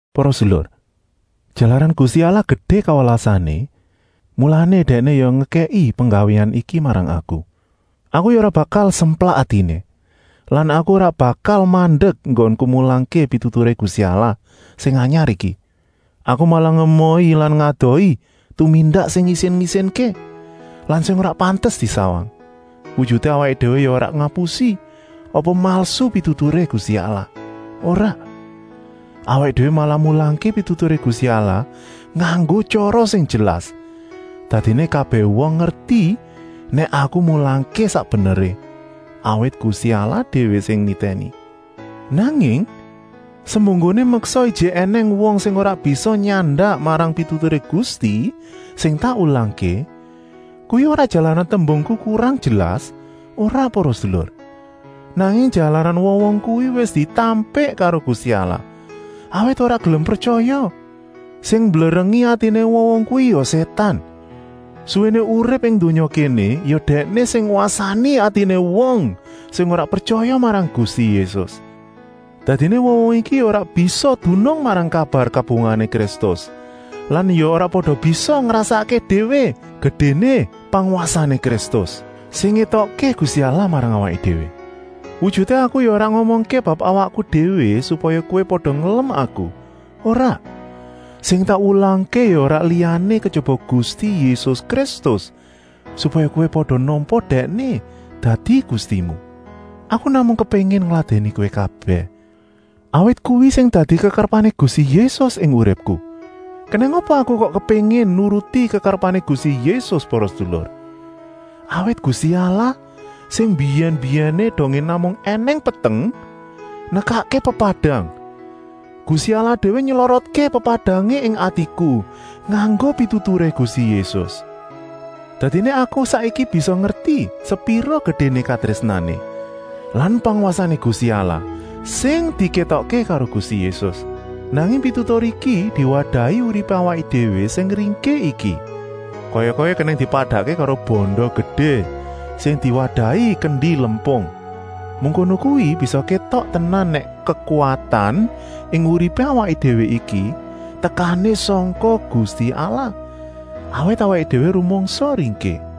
Para sedulur, jalaran Gusti Allah gedé kawelasané, mulané Dèkné ya ngekèki penggawéan iki marang aku. Aku ya ora bakal semplak atiné lan aku ora bakal mandek enggonku mulangké pituturé Gusti Allah sing anyar iki. Aku malah ngemohi lan ngedohi tumindak sing ngisin-isinké lan sing ora pantes disawang. Wujuté awaké déwé ya ora ngapusi apa malsu pituturé Gusti Allah, ora. Awaké déwé malah mulangké pituturé Gusti Allah nganggo tyara sing jelas, dadiné kabèh wong ngerti nèk aku mulangké sak beneré, awit Gusti Allah déwé sing nitèni. Nanging, semunggoné meksa ijik ènèng wong sing ora bisa nyandak marang pituturé Gusti sing tak wulangké, kuwi ora jalaran tembungku kurang jelas, ora para sedulur, nanging jalaran wong-wong kuwi wis ditampik karo Gusti Allah, awit ora gelem pretyaya. Sing mblerengi atiné wong-wong kuwi ya Sétan. Suwéné urip ing donya kéné ya dèkné sing ngwasani atiné wong sing ora pretyaya marang Gusti Yésus. Dadiné wong-wong iki ya ora bisa dunung marang kabar kabungahané Kristus lan ya ora pada bisa ngrasakké déwé gedéné pangwasané Kristus, sing ngétokké Gusti Allah marang awaké déwé. Wujuté aku ya ora ngomongké bab awakku déwé supaya kowé pada ngelem aku, ora. Sing tak wulangké ya ora liyané kejaba Gusti Yésus Kristus, supaya kowé pada nampa Dèkné dadi Gustimu. Aku namung kepéngin ngladèni kowé kabèh, awit kuwi sing dadi kekarepané Gusti Yésus ing uripku. Kenèng apa aku kok kepéngin nuruti kekarepané Gusti Yésus para sedulur? Awit Gusti Allah, sing mbiyèn-mbiyèné, dongé namung ènèng peteng, nekakké pepadang, Gusti Allah déwé nylorotké pepadangé ing atiku nganggo pituturé Gusti Yésus. Dadiné aku saiki bisa ngerti sepira gedéné katrésnané lan pangwasané Gusti Allah, sing dikétokké karo Gusti Yésus. Nanging pitutur iki diwadahi uripé awaké déwé sing ringkih iki. Kaya-kaya kenèng dipadakké karo banda gedé sing diwadahi kendi lempung. Mengkono kuwi bisa kétok tenan nèk kekuwatan ing uripé awaké déwé iki tekané sangka Gusti Allah, awit awaké déwé rumangsa ringkih.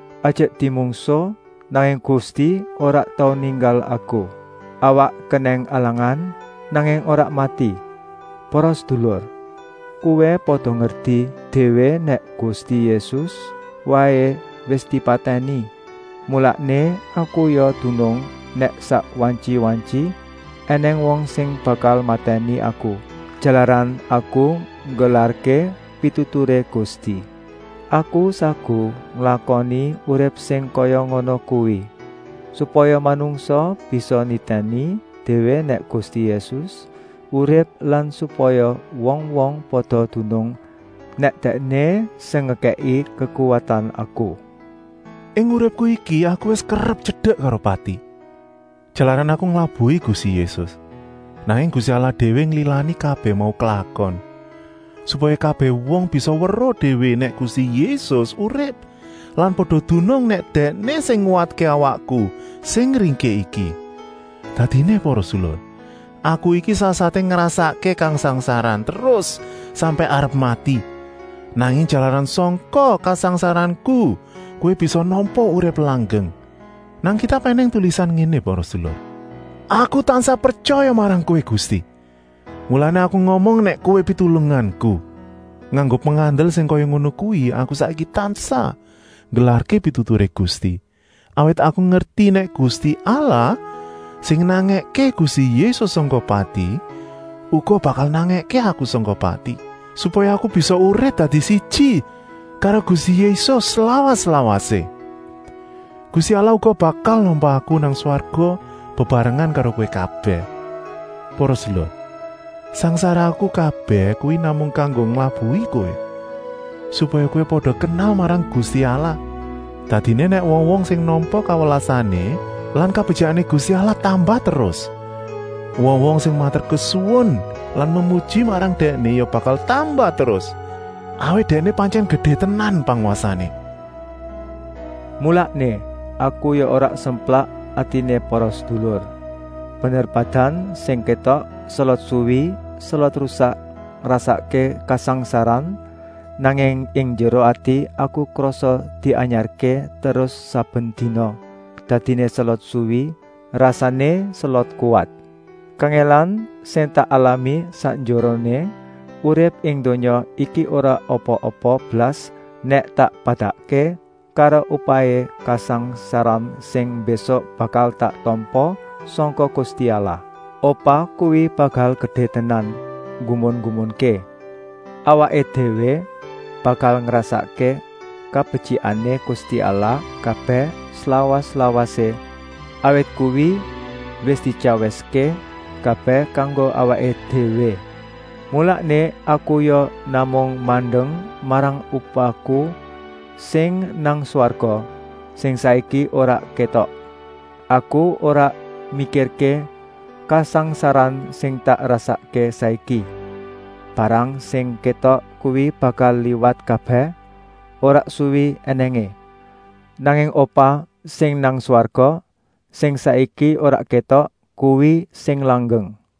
Ajek dimungsuh, nanging Gusti ora tau ninggal aku. Awak kenèng alangan, nanging ora mati. Para sedulur, kowé pada ngerti déwé nèk Gusti Yésus waé wis dipatèni, mulané aku ya dunung nèk sak wantyi-wantyi ènèng wong sing bakal matèni aku, jalaran aku nggelarké pituturé Gusti. Aku saguh nglakoni urip sing kaya ngono kuwi, supaya manungsa bisa nitèni déwé nèk Gusti Yésus urip lan supaya wong-wong pada dunung nèk Dèkné sing ngekèki kekuwatan aku. Ing uripku iki aku wis kerep tyedek karo pati, jalaran aku nglabuhi Gusti Yésus. Nanging Gusti Allah déwé nglilani kabèh mau klakon, supaya kabèh wong bisa weruh déwé nèk Gusti Yésus urip lan pada dunung nèk Dèkné sing nguwatké awakku sing ringkih iki. Dadiné para sedulur, aku iki sasaté ngrasakké kasangsaran terus sampèk arep mati, nanging jalaran sangka kasangsaranku kowé bisa nampa urip langgeng. Nang Kitab ènèng tulisan ngéné para sedulur: “Aku tansah pretyaya marang Kowé Gusti, mulané aku ngomong nèk Kowé Pitulunganku.” Nganggo pengandel sing kaya ngono kuwi aku saiki tansah nggelarké pituturé Gusti, awit aku ngerti nèk Gusti Allah, sing nangèké Gusti Yésus sangka pati, uga bakal nangèké aku sangka pati, supaya aku bisa urip dadi siji karo Gusti Yésus slawas-lawasé. Gusti Allah uga bakal nampa aku nang swarga bebarengan karo kowé kabèh. Para sedulur, sangsaraku kabèh kuwi namung kanggo nglabuhi kowé, supaya kowé pada kenal marang Gusti Allah. Dadiné nèk wong-wong sing nampa kawelasané lan kabetyikané Gusti Allah tambah terus, wong-wong sing maturkesuwun lan memuji marang Dèkné ya bakal tambah terus, awit Dèkné pantyèn gedé tenan pangwasané. Mulané aku ya ora semplak atiné para sedulur. Bener badan sing kétok selot suwi selot rusak ngrasakké kasangsaran, nanging ing njeruh ati aku krasa dianyarké terus saben dina, dadiné selot suwi rasané selot kuwat. Kangèlan sing tak alami sakjeroné urip ing donya iki ora apa-apa blas nèk tak padakké karo upahé kasangsaran sing mbésuk bakal tak tampa sangka Gusti Allah. Upah kuwi bakal gedé tenan, nggumun-nggumunké. Awaké déwé bakal ngrasakké kabetyikané Gusti Allah kabèh slawas-lawasé, awit kuwi wis dityawiské kabèh kanggo awaké déwé. Mulané aku ya namung mandeng marang upahku sing nang swarga, sing saiki ora kétok. Aku ora mikirké kasangsaran sing tak rasakké saiki. Barang sing kétok kuwi bakal liwat kabèh, ora suwi ènèngé. Nanging upah sing nang swarga, sing ora kétok, kuwi sing langgeng.